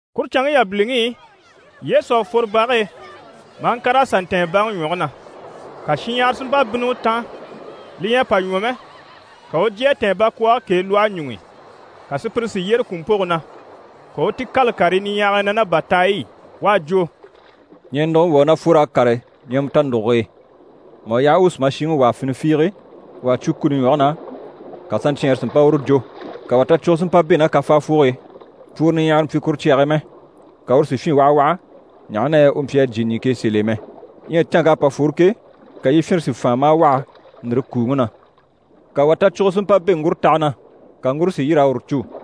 Kuru canŋke yabiliŋi i, Yesu à fworo bage e maa ŋkàr'a sà ntɛ̀ɛn baŋi ɲwɔge na. Ka shinɲyahara si mpa bínni u taan, li ɲyɛ a pa ɲwɔ mɛ, ka u u jyè a tɛ̀ɛn bakwɔɔge k'e lwɔhe ɲuŋ'i, ka sùpyire si yyére kùmpoge na. Ka u u ti kâla karii niɲyahagii na ná bàtaay'i. U à jwo: «Ɲɛɛnuguŋi wà u ná fwor'a kàre ɲɛɛmɛ tanuguge e. Mà u yaha u u sùmashiŋi wàa fini fiige, wà à cwo kuni ɲwɔge na, ka saɲcyɛɛnre si mpa uru jò. Ka wà tacwugo si mpa bɛ̂ ná kafaafoge e, pworo niɲyahara mpyi kuru cyage e mɛ. Ka uru si fyîn wahawaha, ɲaha na yɛ u mpyi a jyè ɲìŋke e sèl'e mɛ. Ɲyɛ canŋk'à pa fworo ke, ka yifyinre si fàan maa waha, ndìre kuuŋi na. Ka wà tacwugo si mpa bɛ̂ ŋgurotaha na, ka ŋgure si yîr'a uru cû.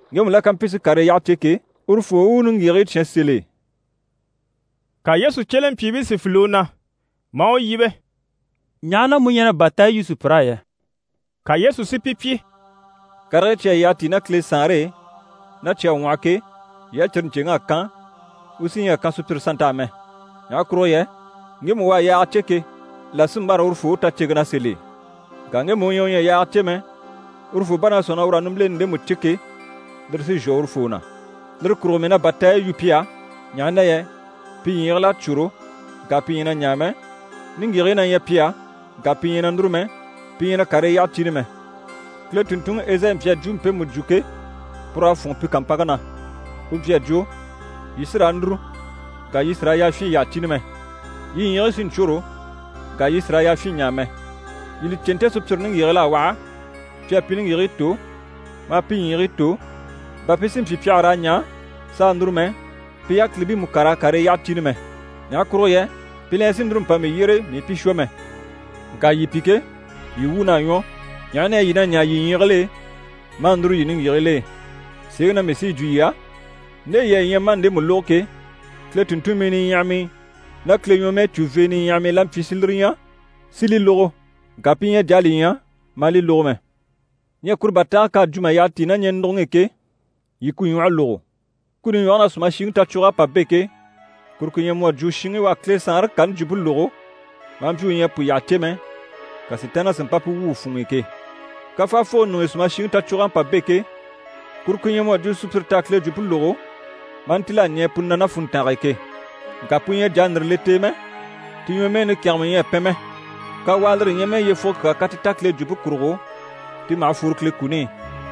Ŋgemu la ká mpyi si karii yyaha cè ke, urufoo u u niŋgyigigii cyán sèl'e.» Ka Yesu cyelempyiibii si file u na, maa u yíbe: «Ɲaha na mu ɲyɛ na bàtaayi yu sùpyir'á yɛ?» Ka Yesu si pi pyi: «Karigii cyi à yyaha tíi ná Kile Saanre e, ná cyi à ŋwɔhɔ ke, yii á cyire ɲcèŋ'à kan, u sí ɲyɛ a kan sùpyire sannt'á mɛ. Ɲaha kurugo yɛ ŋgemu u à yaaga cè ke, là sí n‑bâra urufoo u taceŋke na sèl'e. Ŋka ŋgemu u ɲyɛ u ɲyɛ a yaaga cè mɛ, urufoo bá na sɔ̂nŋi na ur'à nimbileni ndemu cè ke, lire sí n‑shwɔ urufoo na. Lire kurugo mii na bàtaayi yu pi á, ɲaha na yɛ pi ɲyiigil'à cwôro, ŋka pi ɲyɛ na ɲaa mɛ, niŋgyigigii na ɲyɛ pi á, ŋka pi ɲyɛ na núru mɛ, pi ɲyɛ na karii yyaha cìni mɛ. Kile tùnntunŋi Ezayi mpyi a jwumpe mpemu jwo ke, pur'à fûnŋɔ pi kàmpanŋke na. U mpyi a jwo: “Yii sí raa núru, ŋka yii sì raa yafyin yyaha cìni mɛ. Yii ɲyiigii sí n‑cwôro ŋka yii sì raa yafyin ɲaa mɛ. Yii li cè, nte sùpyire niŋgyigigil'à waha, pi à pi niŋgyigigii tò, maa pi ɲyiigii tò, bà pi si mpyi pi àha raa ɲaa s'a núru mɛ, pi yákilibii mú ká raa karii yyaha cìni mɛ. Ɲaha kurugo yɛ pi la ɲyɛ sì núru mpa mii yyére, mii i pi shwɔ mɛ.” Ŋka yii pi ke, yii wuun'à ɲwɔ, ɲaha na yɛ yii na ɲaa yii ɲyiigil'e, maa núru yii niŋgyigigil'e. Sèeŋi na mii sí yi jwo yii á, nde yii à ɲya maa ndemu lógo ke, Kile tùnntunmii niɲyahamii ná Kile ɲwɔmɛɛcuvee niɲyahamii la mpyi si lire ɲya, si li lógo. Ŋka pi ɲyɛ a jà a li ɲya, maa li lógo mɛ. Ɲyɛ kuru bàtaage k'à jwo mà yyaha tíi ná ɲɛɛnuguŋi i ke, yii ku ɲwɔhe lógo. Kuni ɲwɔge na, sùmashiŋi tacwug'à pa bɛ̂ ke, kuru ku ɲyɛ mu à jwo shinŋi u à Kile Saanre kani jwumpe lógo, maa mpyi u ɲyɛ a pu yyaha cè mɛ, ka Sitaanniŋi si mpa pu wwû u funŋ'i ke. Kafaafoge ɲuŋ'i sùmashiŋi tacwug'à pa bɛ̂ ke, kuru ku ɲyɛ mu à jwo sùpyire t'à Kile jwumpe lógo maa ntíl'a ɲɛɛ pu na ná funntange e ke. Ŋka pu ɲyɛ a jà a ndìre le t'e mɛ, ti ɲwɔmɛɛni kɛ̀ngɛmɛ ɲyɛ a pɛn mɛ. Kawaa, lire ɲyɛ mɛ yyefugo kyaa ká ti ta Kile jwumpe kurugo, ti maha fworo Kile kuni i.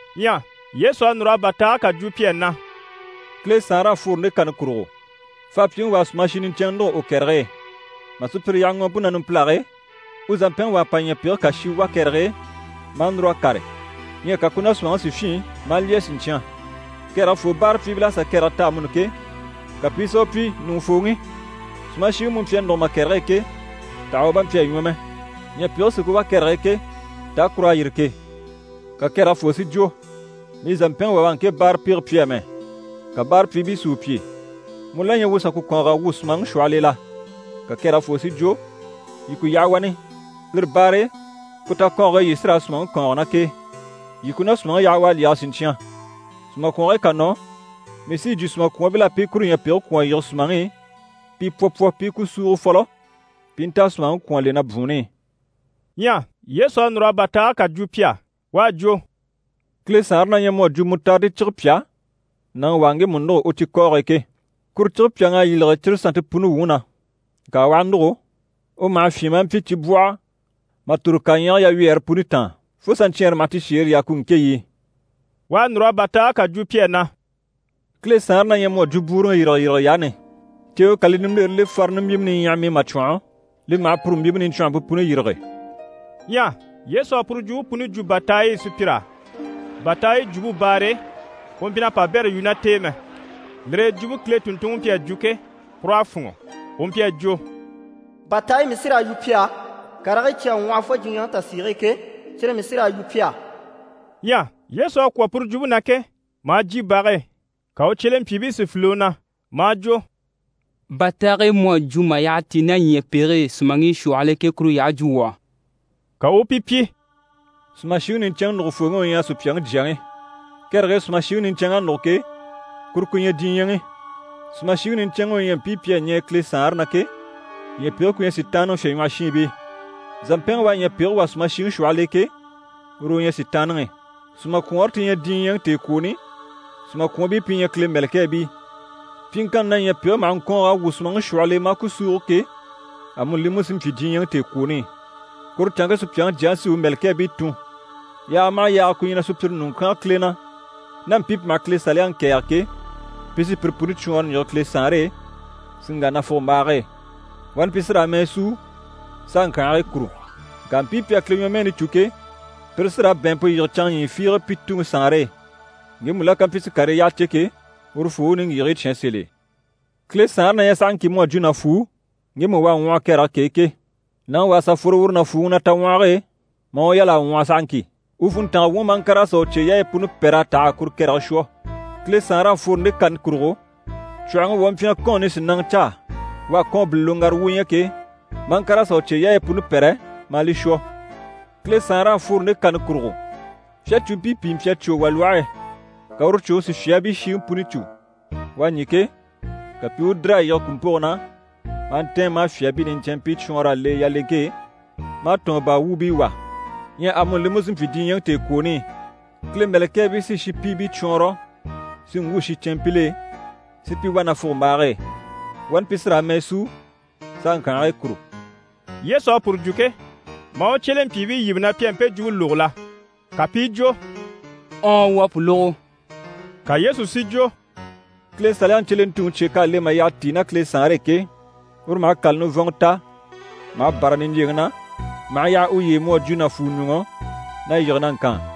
Ɲyɛ Yesu à núr'a bàtaage kà jwo pi á na: «Kile Saanre à fworo nde kani kurugo: faapyiŋi wà à sùmashi niɲcɛnŋɛ nûgo u kɛrɛge e. Mà sùpyire yaha ŋɔɔmpe na numpilage e, u zàmpɛnŋi wà à pa ɲyɛ̀pege kà shi wà kɛrɛge e maa núr'a kàre. Ɲyɛ ka ku ná sùmaŋi si fyîn maa lyɛ siɲcyan. Kɛrɛge foo báarapyiibil'à sà kɛrɛge ta amuni ke, ka pi i sà u pyi “Ɲùŋufooŋi, sùmashiŋi mu mpyi a nûgo ma kɛrɛge e ke, taha u bà mpyi a ɲwɔ mɛ? Ɲyɛ̀pege sí ku wá kɛrɛge e ke, taa kur'à yîri ke?” Ka kɛrɛge foo si jwo “Mii zàmpɛnŋi wà u à ŋke báarapege pyi amɛ.” Ka báarapyiibii si u pyi “Mu la ɲyɛ wuu u sà ku kɔ̀ɔng'a wwû sùmaŋi shwɔhɔl'e la?” Ka kɛrɛge foo si jwo “Yii ku yaha wani, lire baare e, ku takɔɔnge e yii sí raa sùmaŋi kɔ̀ɔnge ná k'e. Yii ku ná sùmaŋi yaha u a lyɛge siɲcyan, sùmakwɔngigii ká nɔ, mii sí yi jwo sùmakwɔɔnbil'á pi i kuru ɲyɛ̀pege kwɔ̀n a yige sùmaŋi i, pi pwɔ pwɔ pi i ku súugo fɔlɔ, pi i nta a sùmaŋi kwɔ̀n a le na bwùunni i.”» Ɲyɛ Yesu à núr'a bàtaage kà jwo pi á. U à jwo: «Kile Saanre na ɲyɛ mu à jwo mutaridi cige pyà nàŋi wà à ŋgemu nûgo u cikɔɔge e ke. Kuru cige pyàŋ'à yîlege cire sannte puni wuŋi na. Ŋka u aha nûgo, u maha fyîn maa mpyi cibwɔhɔ mà tòro kaɲyɛge yawyɛɛre puni taan, fo saɲcyɛɛnre maha ti shèere yaa ku ŋkéɲyi i.» U à núr'a bàtaage kà jwo pi á na: «Kile Saanre na ɲyɛ mu à jwo bwúuruŋi yîrigeyirige yaani. Ceewe ká li nimbilere le farini mbyìmɛ niɲyaham'i mà cwɔ̀nhɔ, li maha puru mbyìmpe niɲcwɔnhɔmpe puni yîrige.» Ɲyɛ Yesu à puru jwumpe puni jwo bàtaay'i sùpyir'á. Bàtaayi jwumpe baare e, u mpyi na pabɛrɛ yu ná t'e mɛ. Lire e jwumpe Kile tùnntunŋi mpyi a jwo ke, pur'à fûnŋɔ, u mpyi a jwo: «Bàtaayi mii sí raa yu pi á, karigii cyi à ŋwɔhɔ fo diɲyɛŋi tasiige e ke, cyire mii sí raa yu pi á.» Ɲyɛ Yesu à kwɔ̀ puru jwumpe na ke, maa jyè bage e, ka u cyelempyiibii si file u na, maa jwo: «Bàtaage mu à jwo mà yyaha tíi ná ɲyɛ̀pege e sùmaŋi shwɔhɔl'e ke, kuru yyaha jwo wuu á.» Ka u u pi pyi: «Sùmashiŋi niɲcɛnŋi nùgufooŋi u ɲyɛ Supyaŋi Jyaŋi. Kɛrɛge e sùmashiŋi niɲcɛnŋ'à nûgo ke, kuru ku ɲyɛ diɲyɛŋi. Sùmashiŋi niɲcɛnŋi u ɲyɛ mpii pi à ɲɛɛ Kile Saanre na ke, ɲyɛ̀pege ku ɲyɛ Sitaanniŋi fyèɲwɔhɔshiinbii. Zàmpɛnŋi u à ɲyɛ̀pege wà sùmaŋi shwɔhɔl'e ke, uru u ɲyɛ Sitaanniŋi. Sùmakwɔɔnre ti ɲyɛ diɲyɛŋi tèekwooni, sùmakwɔɔnbii pi ɲyɛ Kile mɛ̀lɛkɛɛbii. Pyiŋkanni na ɲyɛ̀pege maha ŋkɔ̀ɔng'a wwû sùmaŋi shwɔhɔl'e maa ku súugo ke, amuni li mú sí n‑pyi diɲyɛŋi tèekwooni. Kuru canŋke Supyaŋi Jyaŋi sí u mɛ̀lɛkɛɛbii tun. Yaaga maha yaaga ku ɲyɛ na sùpyire ɲùŋɔ kyánge Kile na, ná mpii pi maha Kile Saliyaŋi kɛ̀ɛge ke, pi sí pire puni cwɔɔnrɔ n‑yige Kile Saanre e, si ŋgà nafugombaage e. Wani pi sí raa mɛɛ súu s'a ŋkyànhigii kùru. Ŋka mpii pi à Kile ɲwɔmɛɛni cû ke, pire sí raa bɛ̀ɛnmpe yige canŋa ɲyii fiige pi Tuŋi Saanre e. Ŋgemu la ká mpyi si karii yyaha cè ke, urufoo u u niŋgyigigii cyán sèl'e.» Kile Saanre na ɲyɛ sahaŋki mu à jwo nàfuu ŋgemu u à ŋwɔhɔ kɛrɛge k'e ke. Nàŋi wà à sà fworo uru nàfuuŋi na taŋwɔhɔge e, maa u yal'a ŋwɔhɔ sahaŋki. U funntanga wuŋi, maa ŋkàr'a sà u cyeyaayi puni pɛ́r'a tɛ̀g'a kuru kɛrɛge shwɔ. Kile Saanre à fworo nde kani kurugo: cwɔ̀hɔŋi wà u mpyi na kɔ́ɔn nisinaŋa caa. U à kɔ́ɔnbile loŋgara wu ɲya ke, maa ŋkàr'a sà u cyeyaayi puni pɛ́rɛ, maa li shwɔ. Kile Saanre à fworo nde kani kurugo: fyacuumpii pìi mpyi a cwò wà lwɔhe e, ka uru cwòŋi si fyaabii shiŋi puni cû. U à ɲî ke, ka pi i u dìr'a yige kùmpoge na, maa ntɛ̀ɛn maa fyaabii niɲcɛnmpii cwɔɔnr'a le yaleŋke e, maa tɔ̀ɔn baa wuubii wà. Ɲyɛ amuni li mú sí n‑pyi diɲyɛŋi tèekwooni i. Kile mɛ̀lɛkɛɛbii sí shinpiibii cwɔɔnrɔ si ŋgwû shincɛnmpil'e, si pi wà nafugombaage e. Wani pi sí raa mɛɛ súu s'a ŋkyànhigii kùru. Yesu à puru jwo ke, maa u cyelempyiibii yíbe na pi à mpe jwumpe lógo la? Ka pi i jwo: «Ɔɔn, wuu à pu lógo.» Ka Yesu si jwo: «Kile Saliyaŋi cyelentuŋi cye k'à le mà yyaha tíi ná Kile Saanre e ke, uru maha kàla nivɔnŋɔ ta maha bâra niɲjyeŋi na maha yaha uye e, mu à jwo nàfuɲuŋɔ na yige na ŋkaan.»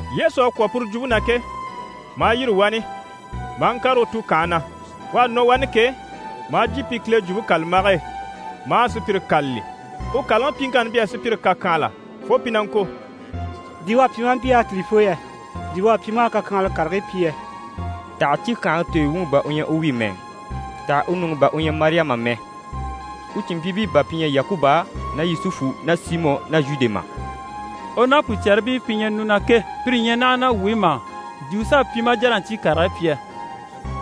Yesu à kwɔ̀ puru jwumpe na ke, maa yîri wani, maa ŋkàre u tukanhe na. U à nɔ wani ke, maa jyè pi Kile Jwumpe kàlambage e, maa sùpyire kâlali. U kàlaŋi pyiŋkanni mpyi a sùpyire kàkyanhala fo pi na ŋko: «Di u à pyi maa mpyi yákilifoo yɛ? Di u à pyi maa kakyanhala karigii pyi yɛ? Taha cíkyangaŋi tooyo wuŋi bà u ɲyɛ u wi mɛ? Taha u nuŋi bà u ɲyɛ Mariyama mɛ? U cìnmpyiibii bà pi ɲyɛ Yakuba ná Yusufu ná Simɔ ná Zhude mà? U ná pùcɛribii pi ɲyɛ nu na ke, pire ɲyɛ naha ná wuu e mà? Di u s'à pyi maa jà na ɲcyii karigii pyi yɛ?»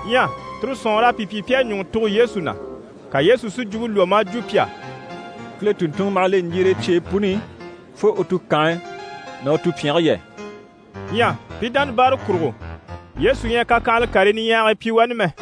Ɲyɛ tire sɔ̀nŋɔr'à pi pyi pi à ɲùŋɔ tugo Yesu na. Ka Yesu si jwumpe lwɔ́ maa jwo pi á: «Kile tùnntunŋɔ maha le ɲjire e cyeyi puni i fo u tukanhe ná u tupyɛnge yɛ!» Ɲyɛ pi dánabaare kurugo, Yesu ɲyɛ a kakyanhala karii niɲyahagii pyi wani mɛ.